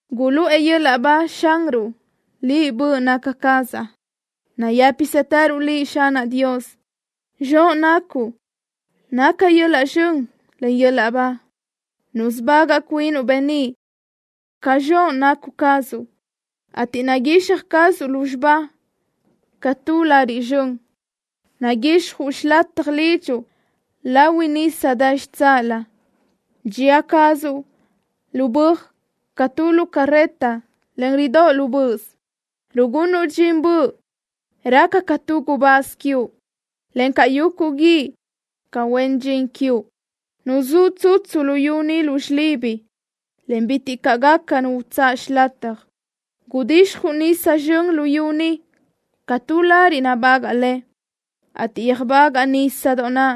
¡Guluʼë yöl-laʼ ba Xanruʼ, liʼ, böʼ naca cazaʼ! ¡Nayë́pisëtëruʼ Liʼ, Xanaʼ Dios! ¡Zxoʼ nacuʼ naca yöl-laʼ zxön, en yöl-laʼ ba! ¡Nusubagaʼ cuinuʼ beníʼ ca zxoʼ nacu cazuʼ, ateʼ naguixaj cazuʼ lúzxiba ca tu lariʼ zxön! Naguixjuʼ xilataj lidxuʼ lahui nisa dë xitsáʼalö. Dxía cazuʼ lu böaj ca tu lu carreta, en ridóʼ lu böʼös. Rugunuʼ dxin böʼ raca ca tu gubáz quiuʼ, encaʼ yuguʼ guíʼ ca huen dxin quiuʼ. Nuzúʼ tsutsu luyú ni lu xilibi, en bitiʼ caʼ gaca nu utsáʼ xilataj. Gudixjuʼ nisa zxön luyú ni ca tu lariʼ nabagaʼ le, ateʼ yöjbagaʼ nísadoʼ naʼ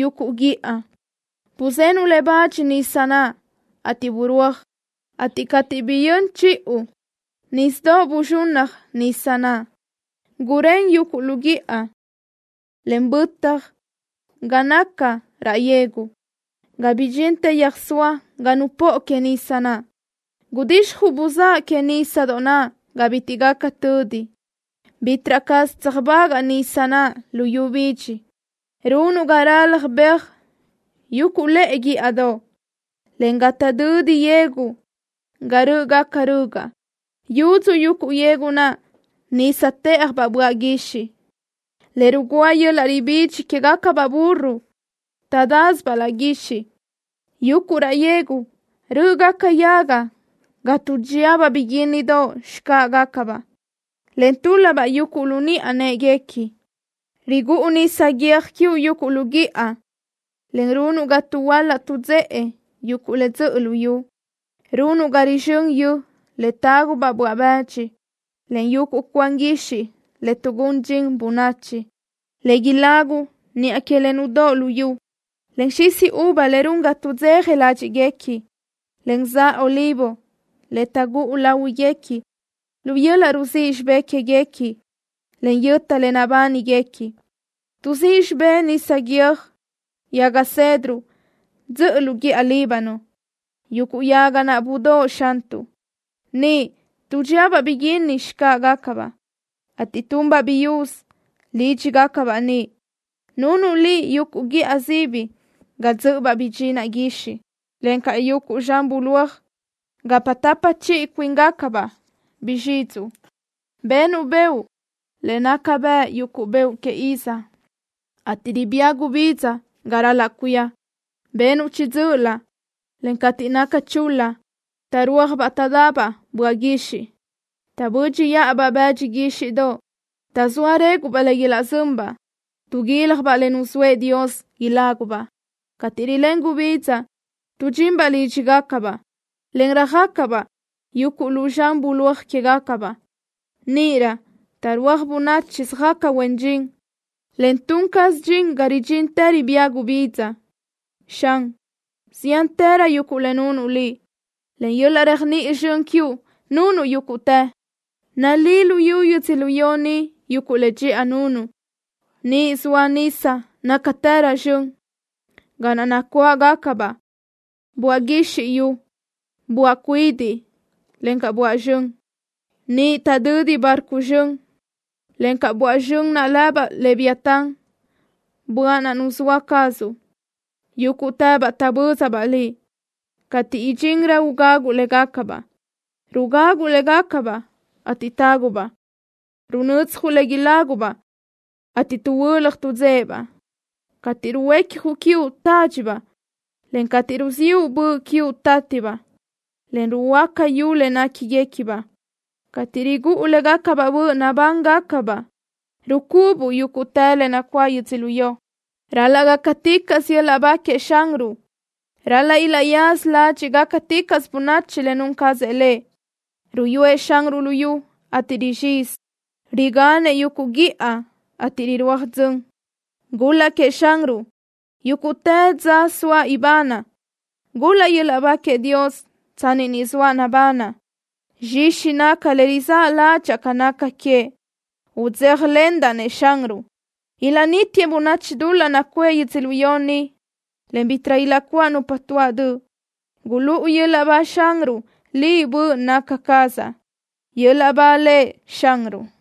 yuguʼ guíʼa. Buzenuʼ le bach nisa naʼ, ateʼ burúaj, en cateʼ biyö́n chiʼu, bayúdx buzxunnaj nisa naʼ. Gurén yuguʼ lu guíʼa, en bötaj ga naca raʼ yegu, ga bidxintë yöjsóa ga nupóʼo que nisa naʼ. Gudixjuʼ buzáʼ que nísadoʼ ga bitiʼ gaca tödi. Bítiʼrö caz tseajbagaʼ nisa naʼ luyú bidxi. Runuʼ ga ralaj beaj yuguʼ lëʼe guíʼadoʼ, encaʼ ga taʼdödi yegu ga rö́ʼögaca rögaʼ. Yudzu yuguʼ yegu naʼ nisa të́ʼajbaʼ böaʼ guixiʼ, le rugúa yöl-laʼ ribídx quégacabaʼ burro taʼdásibaʼ laʼ guixiʼ. Yuguʼ raʼ yegu rö́ʼögaca yaga ga tuʼdxíabaʼ biguínnidoʼ xcáʼagacabaʼ, en túl-labaʼ yuguʼ lu niʼa në́ʼeguequi. Rigúʼu nisa guiö́j quiuʼ yuguʼ lu guíʼa, en runuʼ ga tuʼhuöla tuʼdzéʼe yuguʼ le dzöʼö luyú. Runuʼ ga rizxö́n yö le tágubaʼ böaʼ bëdx, en yuguʼ cuan guixiʼ tuʼgún dxin bönachi, le ilagu niʼa que le nudóʼo luyú, en xisi uva le run ga tudzeja ládxiʼguequi, en za olivo le taʼgúʼu láhuiguequi lu yöl-laʼ ruzíʼ xibé quéguequi, en yöta le nabániguequi. Tuʼzíʼ xibé nisa guiö́j yaga cedro dzöʼö lu guíʼa Líbano, yuguʼ yaga naʼ budóʼo, Xantuʼ. Niʼ tuʼdxiabaʼ biguínni xcáʼagacabaʼ, ateʼ tunbaʼ biyúz lídxigacabaʼ niʼ. Nunuʼ Liʼ yuguʼ guíʼa sibi ga dzö́ʼöbaʼ bdxinaʼ guixiʼ, encaʼ yuguʼ zxan bulóaj gapa tapa chiʼi cuíngacabaʼ bizxidxuʼ. Benuʼ beoʼ le naca bëʼ yuguʼ beoʼ que iz, ateʼ ribía gubidza ga ral-laʼ cuía. Benuʼ chiʼi dzö́ʼölö, en cateʼ naca chul-la taʼrúajbaʼ taʼdabaʼ böaʼ guixiʼ. Taʼbö́dxiʼabaʼ bëdxi guíxiʼdoʼ, taʼzóa réguʼbaʼ le ilaʼzönbaʼ. Tuʼguílajbaʼ le nuzóëʼ Dios ilágubaʼ. Cateʼ rilén gubidza tuʼdxinbaʼ lídxigacabaʼ, en röjö́xagacabaʼ yuguʼ lu zxan bulóaj quégacabaʼ. Níʼirö taʼrúaj bönachi söjaca huen dxin, en tun caz dxin ga ridxintë ribía gubidza. Xan, ziántërö yuguʼ le nunuʼ Liʼ. Len yöl-laʼ réajniʼi zxön quiuʼ nunuʼ yúguʼtë. Nalí luyú yödzölió ni yuguʼ le dxiʼa nunuʼ. Niʼ zoa nisa nácatërö zxön, ga naʼ nacuáʼabaʼ böaʼ guizxi yu, böaʼ cuidiʼ, encaʼ böaʼ zxön. Niʼ taʼdödi barco zxön, encaʼ böaʼ zxön lëbaʼ leviatán, böaʼ naʼ nuzóa cazuʼ. Yúguʼtëbaʼ taʼbö́zabaʼ Liʼ, cateʼ idxinrö ugaguʼ légacabaʼ. Rugaguʼ légacabaʼ, ateʼ tágubaʼ. Runödzjuʼ le ilágubaʼ, ateʼ tuʼhuö́laj taʼdzéʼebaʼ. Cateʼ ruhuecjuʼ quiuʼ, tádxibaʼ, en cateʼ ruziʼu böʼ quiuʼ, tátibaʼ, en ruhuöáca yu le néquinigacabaʼ. Cateʼ rigúʼu légacabaʼ böʼ, nabángacabaʼ. Rucubuʼ yúguʼtë le nacuáʼ yödzölió. ¡Ral-laʼ gácaticaʼsö yöl-laʼ ba queëʼ Xanruʼ! ¡Ral-laʼ ilaʼyaza ládxiʼticaʼsö bönachi le nun cazëʼ Lëʼ! Ruyúëʼ Xanruʼ luyú, ateʼ rizxizi. Riganëʼ yuguʼ guíʼa, ateʼ rirúaj dzön. ¡Gul-laʼ queëʼ Xanruʼ yúguʼtë dza soaʼ ibanaʼ! ¡Gul-laʼ yöl-laʼ ba queëʼ Dios tsanni ni zoaʼ nabanaʼ! ¡Zxixi naca le rizáʼ ládxaʼa ca naca queëʼ! ¡Udzéjalendaʼ-nëʼ Xanruʼ! Ilaʼnítiëʼ bönniʼ dul-laʼ nacuʼë yödzölió ni, en bítiʼrö ilaʼcuáʼ nupa tuáʼ döʼ. ¡Gulúʼu yöl-laʼ ba Xanruʼ, liʼ, böʼ naca cazaʼ! ¡Yöl-laʼ ba Lëʼ Xanruʼ!